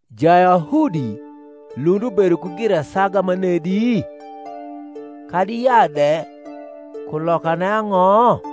Jayahudi lund ubedo ku girasaga manedi? kadi yaa de kulokane ang’o?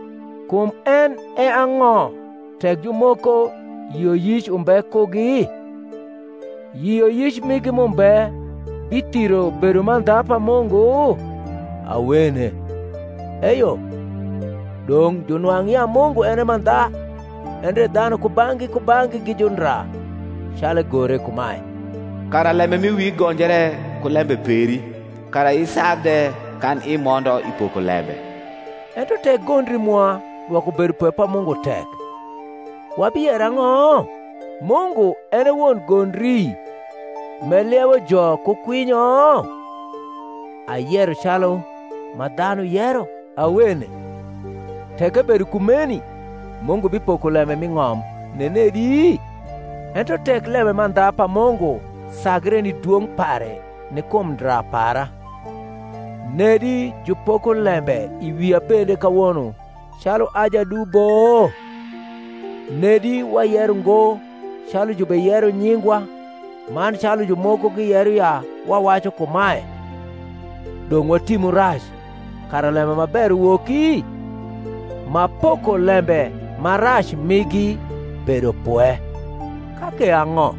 Kum en e ang’o tek jumoko yioyic umbe kugi? yioyic migi m’umbe bithiro bedomandha pa Mungu? Awene: eyo, dong’ junwang’ ya Mungu en e mandha, endre dhanu kubang’gi kubang’gi gi jundra; calu egore kumae, Kara lembe m’i wii gonjre ku lembe peri, Kara isag de kan imondo i pokolembe. Ento tek gondri mwa dwoko bedopwe pa Mungu tek, wabiyero ang’o? Mungu en e won gondri m’eliewo jo ku kwinyo? (Ayero calu ma dhanu yero.) Awene: tek ebedo kumeni Mungu bipoko lembe mi ng’om nenedi? Ento tek lemandha pa Mungu sagre ni dwong’ pare ni kum ndra para, nedi jupoko lembe i wia bende kawono calu a jadubo? nedi wayero ngo (calu jubeyero nyingwa, man calu jumoko giyero ya wawacu kumae), Dong’ watimu rac, kara lembe ma ber uwoki? ma pokolembe ma rac migi bedo pwe. Ka ke ang’o?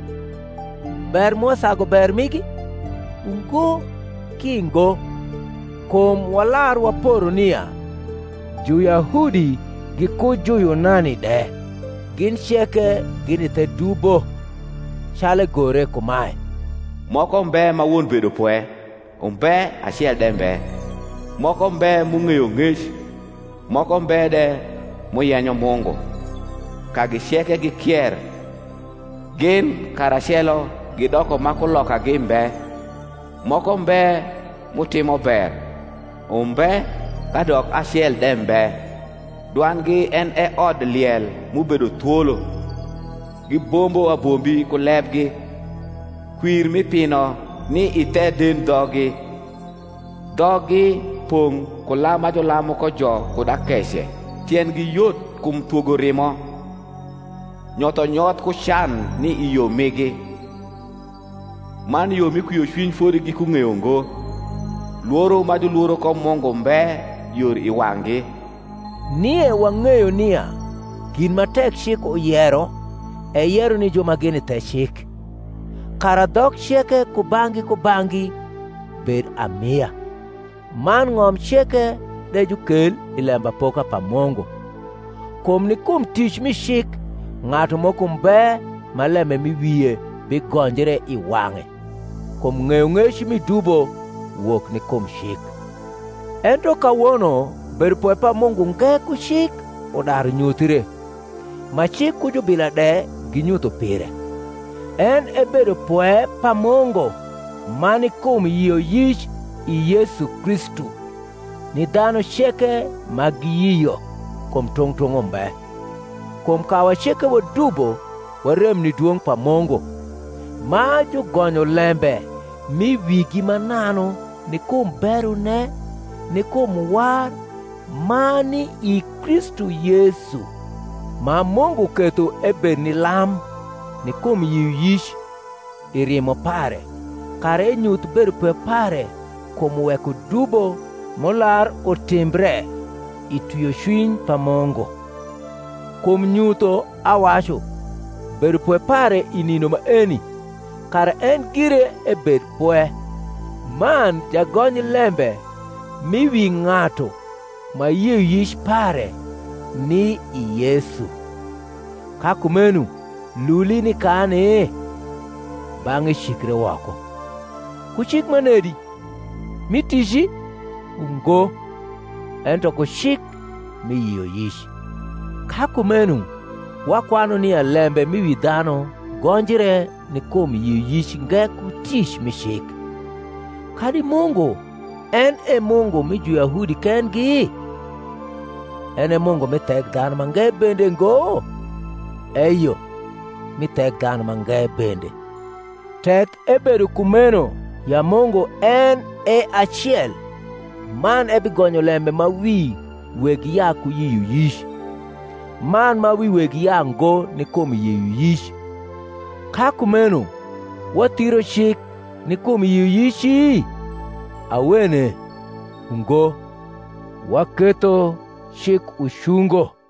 ber mwa sagu ber migi? Ungo, ki ngo: kum walar waporo nia Juyahudi giku Juyunani de, gin ceke gini the dubo: calu egore kumae, Moko mbe ma won bedopwe, umbe, acel de mbe; Moko mbe m’ung’eyo ng’ec, Moko mbe de m’uyenyo Mungu; Kagi ceke gikier, gin karacelo gidoko ma kulokagi mbe; Moko mbe m’utimo ber, umbe, kadok acel de mbe: Dwandgi en e odliel m’ubedo thwolo; Gibombo abombi ku lebgi: Kwir mi pino ni i the dendhoggi: Dhoggi pong’ ku lam ma julamu ko jo kud akece: Tiendgi yot kum thwogo rimo; Nyothonyoth ku can ni i yo migi; Man yo mi kwiocwiny fodi gikung’eyo ngo: Lworo ma julworo ko Mungu mbe yor i wang’gi. Nie wang’eyo nia gin ma tek cik uyero eyero ni ju ma gini the cik; kara dhok ceke kubang’gi kubang’gi bed amia, man ng’om ceke de jukel i lembapoka pa Mungu: kum ni kum tic mi cik ng’atu moko mbe ma lembe m’i wie bigonjre i wang’e; kum ng’eyong’ec mi dubo wok ni kum cik. Ento kawono bedopwe pa Mungu nge ku cik udaru nyuthre, ma cik ku jubila de ginyutho pire; en e bedopwe pa Mungu ma ni kum yioyic i Yesu Kristu ni dhanu ceke ma giyio; kum tung’ tung’ umbe; kum kawa ceke wadubo warem ni dwong’ pa Mungu; ma jugonyo lembe m’i wigi mananu ni kum berone ni kum war ma ni i Kristu Yesu: ma Mungu ketho ebed ni lam, ni kum yioyic, i rimo pare, kara enyuth bedopwe pare kum wekodubo m’ular utimbre, i twiocwiny pa Mungu; kum nyutho, awacu, bedopwe pare i nindo maeni; kara en gire ebed pwe, man jagony lembe m’i wi ng’atu ma yioyic pare ni i Yesu. Ka kumeno luli nikani? Bang’e cikre woko. Ku cik manedi? mi tici? Ungo: ento ku cik mi yioyic. Ka kumeno wakwanu nia lembe m’i wi dhanu gonjre ni kum yioyic nge ku tic mi cik. Kadi Mungu en e Mungu mi Juyahudi kendgi? en e Mungu mi Thekdhanumange bende ngo? Eyo, mi Thekdhanumange bende: tek ebedo kumeno ya Mungu en e acel, man ebigonyo lembe ma wi weg yaa ku yioyic, man ma wi weg yaango ni kum yioyic. Ka kumeno wathiro cik ni kum yioyici? Awene: ungo, waketho cik ucungo.